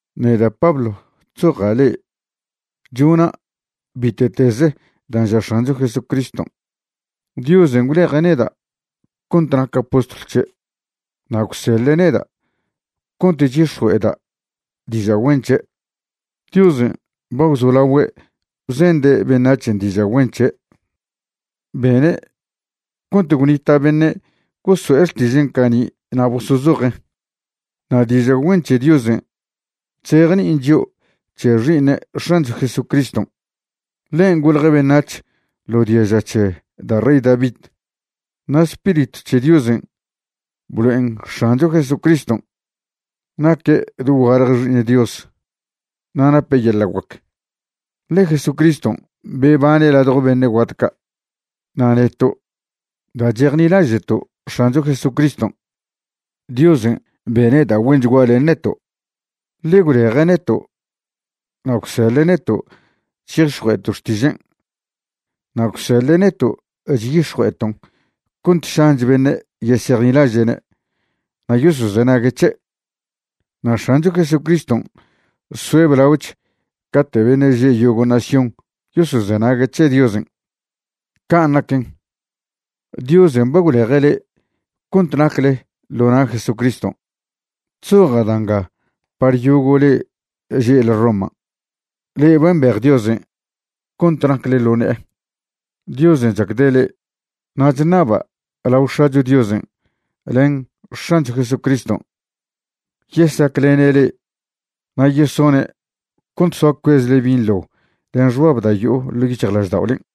Neda' Pablo chzoja' le'e. Chona' bite'tez dan' ža X̱ancho Jesucriston'. Diosen' gwleje' neda' cont naca' postlw c̱he', na' gwseḻe' neda' cont chyix̱jue'eda' diža' güen c̱he'. Diosen' ba gwzolagüe' bzende' beṉac̱hen' diža' güen c̱he', bene' cont gwnita' beṉe' goso'e xtižen' cani' na' bozozojen'. Na' diža' güen c̱he Diosen' chzejni'in chio' c̱he Xi'iṉe' X̱ancho Jesucriston'. Ḻen' golje' beṉac̱h ḻo diaža c̱he da' rey David. Na' Spiritw c̱he Diosen' blo'en X̱ancho Jesucriston' naque' dogualje Xi'iṉ Dios na' nape' yeḻa' guac, ḻe Jesucriston' bebane' ladjo beṉe' guat ca'. Na' neto', da' chejnilaže'to' X̱ancho Jesucriston', Diosen' bene' da' güenchgua len neto', ḻe gwleje' neto' na' gwseḻe' neto' chyix̱jue'eto' xtižen'. Na' gwseḻe' neto' chyix̱jue'eton' cont šanch beṉe' yesejnilaže'ne' na' yosozenague' c̱he'. Na' X̱ancho Jesucriston' soe' blaoch cate' beṉe' že' yogo' nación yosozenague' c̱he Diosen'. Can' naquen, Diosen' ba gwleje' le'e cont nacle ḻo na' Jesucriston'. Chzoja' da' nga par yogo' le'e že'le Roman' le'e ba mbej Diosen' cont nacle ḻo ne'e. Diosen' chacde' le'e. Na' chṉaba' lao X̱acho Diosen' len X̱ancho Jesucriston' yesaclene' le'e na' yesone' cont soa cuezle binḻo len xbab da' yo'o ḻo' yic̱hjlažda'olen'.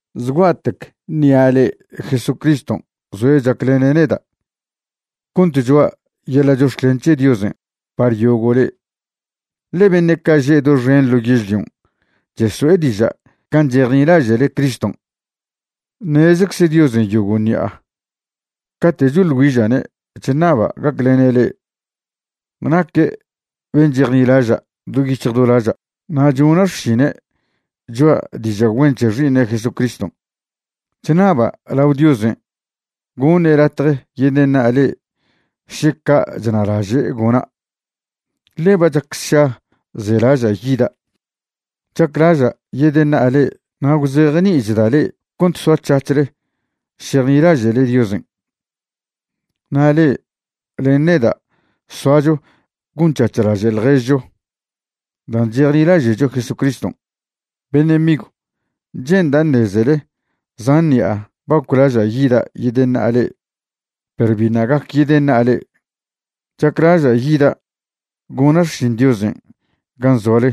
Zgua'tec ṉi'a le'e Jesucriston' zoe' chaclene' neda' cont choa' yeḻa' chox̱clen c̱he Diosen' par yogo' le'e, ḻe beṉe' ca' že' doxen ḻo yežlion' cheso'e diža' can' chejnilaže'le Criston'. Ṉezcze Diosen' yogo' ṉi'a cate' choḻ güiža'ne' chṉaba' gaclene' le'e. Naque' ben' chejnilaža' do yic̱hj do laža' na' chona' xšinen' choa' diža' güen c̱he Xi'iṉe' Jesucriston'. Chṉaba' lao Diosen' goṉe' latje yedeṉa'a le'e še ca' chnalaže' gona', ḻe ba chac sša zelaža' yida'. Chaclaža' yedeṉa'a le'e na' gwzejni'ichda' le'e cont soac̱hac̱hle šejnilaže'le Diosen'. Na' le'e len neda' soacho gonc̱hac̱hlaže' ḻježcho dan' chejnilaže'cho Jesucriston'. Beṉe' migw, che'nda' ṉezele zan ṉi'a ba goclaža' yida' yedeṉa'a le'e, perw biṉa' gac yedeṉa'a le'e. Chaclaža' yida' gona' xšin Diosen' gan zoale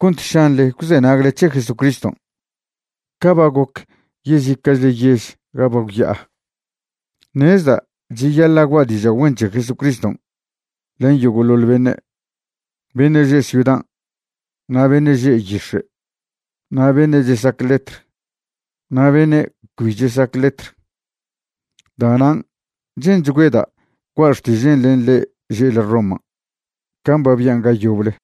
cont šanḻe gwzenagle c̱he Jesucriston' ca ba goc yezica'chle yež ga ba gwya'a. Ṉezda' cheyaḻa' gua' diža' güen c̱he Jesucriston' len yogo'ḻoḻ beṉe', beṉe' že' ciudan', na' beṉe' že' yix̱e', na' beṉe' chesac letr na' beṉe' cbi chesac letr. Da'nan' che'nchgüeda' gua' xtižen' len le'e že'le Roman' can' ba bian' ga yoble.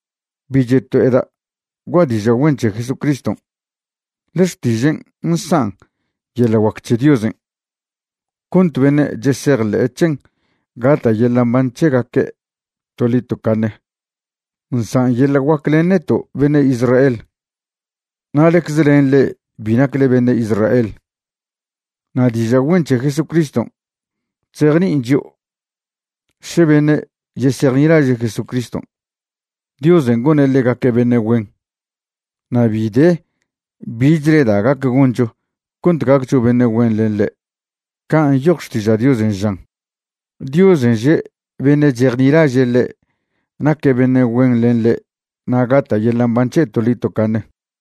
Bi cheto'eda' gua' diža' güen c̱he Jesucriston', ḻe xtižen' nsan' yeḻa' guac c̱he Diosen' cont beṉe' chesejḻe' c̱hen gata' yeḻa' mban c̱hegaque' toḻi tocaṉe. Nsan' yeḻa' guac len neto' beṉe' Israel, na' ḻecze len le'e bi nacle beṉe' Israel. Na' diža' güen c̱he Jesucriston' chzejni'in chio' še beṉe' yesejnilaže' Jesucriston', Diosen' gone' ḻegaque' beṉe' güen, na' bi de bichle da' gac goncho cont gaccho beṉe' güen len ḻe'. Can' nyoj Xtiža' Diosen' žan: “Diosen' že' beṉe' chejnilaže' ḻe' naque' beṉe' güen len ḻe' na' gata' yeḻa' mban c̱he' toḻi tocaṉe.”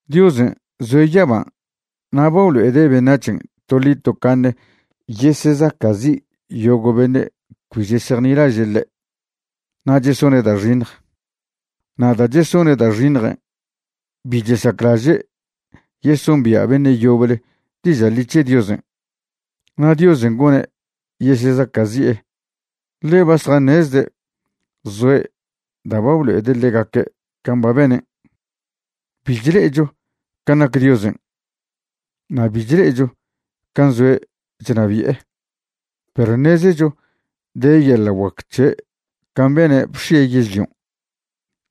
Diosen' zoe' yaban' na' ba blo'ede' beṉac̱hen' toḻi tocaṉe yesesaca'zi' yogo' beṉe' cbi chesejnilaže' ḻe' na' chesone' da' xiṉj. Na' da' chesone' da' xiṉjen' bi chesaclaže' yesombia' beṉe' yoble diža' ḻi c̱he Diosen'. Na' Diosen' gone' yesezaca'zi'e, ḻe ba zjaṉezde' zoe' da' ba blo'ede' ḻegaque' can' ba benen'. Bi chle'echo can' nac Diosen', na' bi chle'echo can' zoe' chnabi'e, perw ṉezecho de yeḻa' guac c̱he' can' bene' bx̱ie' yežlion',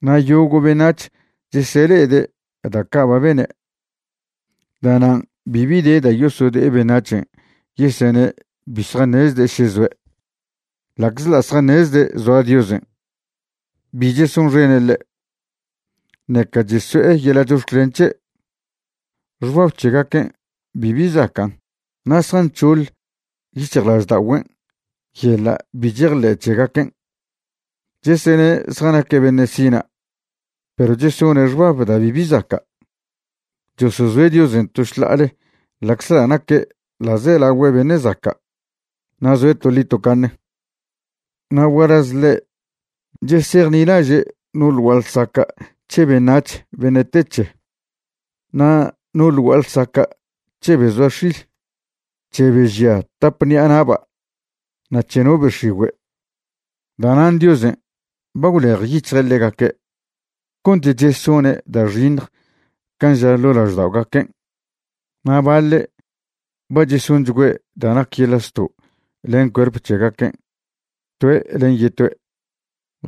na' yogo' beṉac̱h chesele'ede' da' ca' ba bene'. Da'nan' bibi de da' yosode'e beṉac̱hen' yesene' bi zjaṉezde' še zoe'. Ḻa'czḻa' zjaṉezde' zoa Diosen', bi chesonxene' ḻe', ṉeca cheso'e yeḻa' chox̱clen c̱he'. Xbab c̱hegaquen' bibi zacan' na' zjanc̱hoḻ yic̱hjlažda'ogüen' yeḻa' bi chejḻe' c̱hegaquen'. Chesene' zjanaque' beṉe' sina' perw chesone' xbab da' bibi zaca'. Chosozoe' Diosen' to šḻa'ale ḻa'czḻa' naque' ḻa'zelagüe' beṉe' zaca' na' zoe' toḻi tocaṉe. Na' gualaz ḻe', chesejnilaže' no ḻ gua'a ḻsaca' c̱he beṉac̱h beṉe' te c̱he, na' no ḻ gua'a ḻsaca' c̱he be zoa x̱il, c̱he be žia tap ṉi'a na'ba' na' c̱he no be x̱igüe'. Da'nan' Diosen' ba gwlejyic̱hje' ḻegaque' cont chesone' da' xiṉj can' ža ḻo' lažda'ogaquen', na' baḻe' ba chesonchgüe' da' nac yeḻa' zto' len cuerp c̱hegaquen' toe' len yetoe'.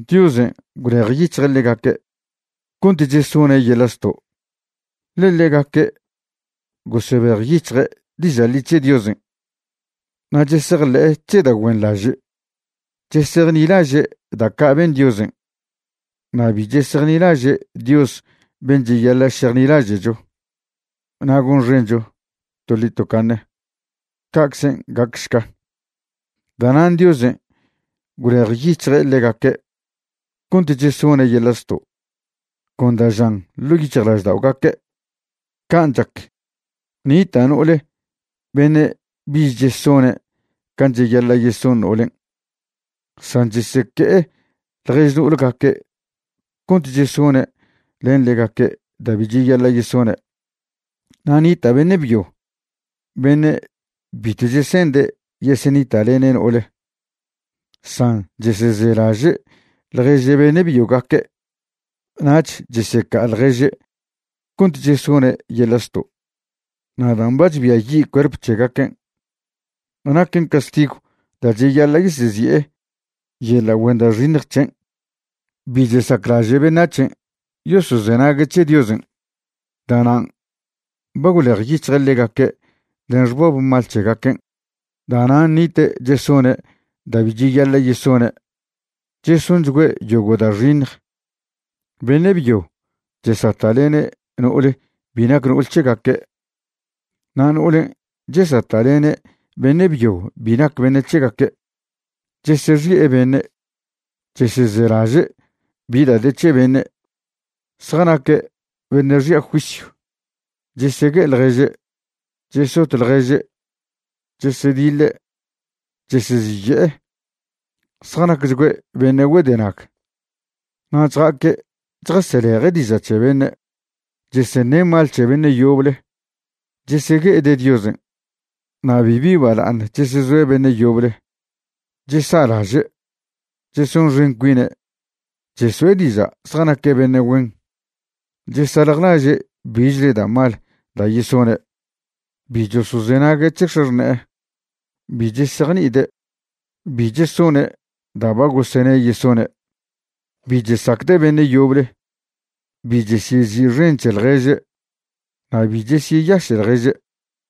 Diosen' gwlejyic̱hje' ḻegaque' cont chesone' yeḻa' zto', ḻe ḻegaque' gosebejyic̱hje' diža' ḻi c̱he Diosen' na' chesejḻe'e c̱he da' güenḻaže'. Chesejnilaže' da' ca' ben Diosen' na' bi chesejnilaže' Dios ben' cheyaḻa' šejnilaže'cho na' gonxencho toḻi tocaṉe. Ca'czen' gacšca. Da'nan' Diosen' gwlejyic̱hje' ḻegaque' cont chesone' yeḻa' zto' con da' žan ḻo' yic̱hjlažda'ogaque'. Can' chac, nita' no'ole beṉe' bich chesone' can' cheyaḻa' yeson no'olen', san cheseque'e ḻjež no'olgaque' cont chesone' len ḻegaque' da' bi cheyaḻa' yesone'. Na' nita' beṉe' byo beṉe' bitw chese'nde' yesenita'lene' no'ole, san chesezelaže' ḻjež beṉe' byogaque' nach cheseca'a ḻježe' cont chesone' yeḻa' zto'. Na' dan' ba chbiayi' cuerp c̱hegaquen', naquen castigw da' cheyaḻa' yesezi'e yeḻa' güen da' xiṉj c̱hen'. Bi chesaclaže' beṉac̱hen' yosozenague' c̱he Diosen', da'nan' ba gwlejyic̱hje' ḻegaque' len xbab mal c̱hegaquen'. Da'nan' nite' chesone' da' bi cheyaḻa' yesone'. Chesonchgüe' yogo' da' xiṉj. Beṉe' byo chesata'lene' no'ole bi nac no'ol c̱hegaque', na' no'olen' chesata'lene' beṉe' byo bi nac beṉe' c̱hegaque'. Chesexi'e beṉe'. Chesezelaže' bi da' de c̱he beṉe'. Zjanaque' beṉe' xi'a juisyw, chesegue'e ḻježe', chesot ḻježe', chesediḻe', cheseziye'e, zjanacchgüe' beṉe' güedenag, na' chja'aque' chjaseleje' diža' c̱he beṉe'. Cheseṉe' mal c̱he beṉe' yoble, chesegue'ede' Diosen', na' bibi bala'aṉ chesezoe' beṉe' yoble. Chesa'laže'. Chesonxen cuine' cheso'e diža' zjanaque' beṉe' güen. Chesaljlaže' bichle da' mal da' yesone'. Bi chosozenague' c̱he x̱axṉe'e. Bi chesejni'ide'. Bi chesone' da ba gosene' yesone'. Bi chesacde' beṉe' yoble. Bi chesyezi'xen c̱he ḻježe' na' bi chesyeyaše' ḻježe'.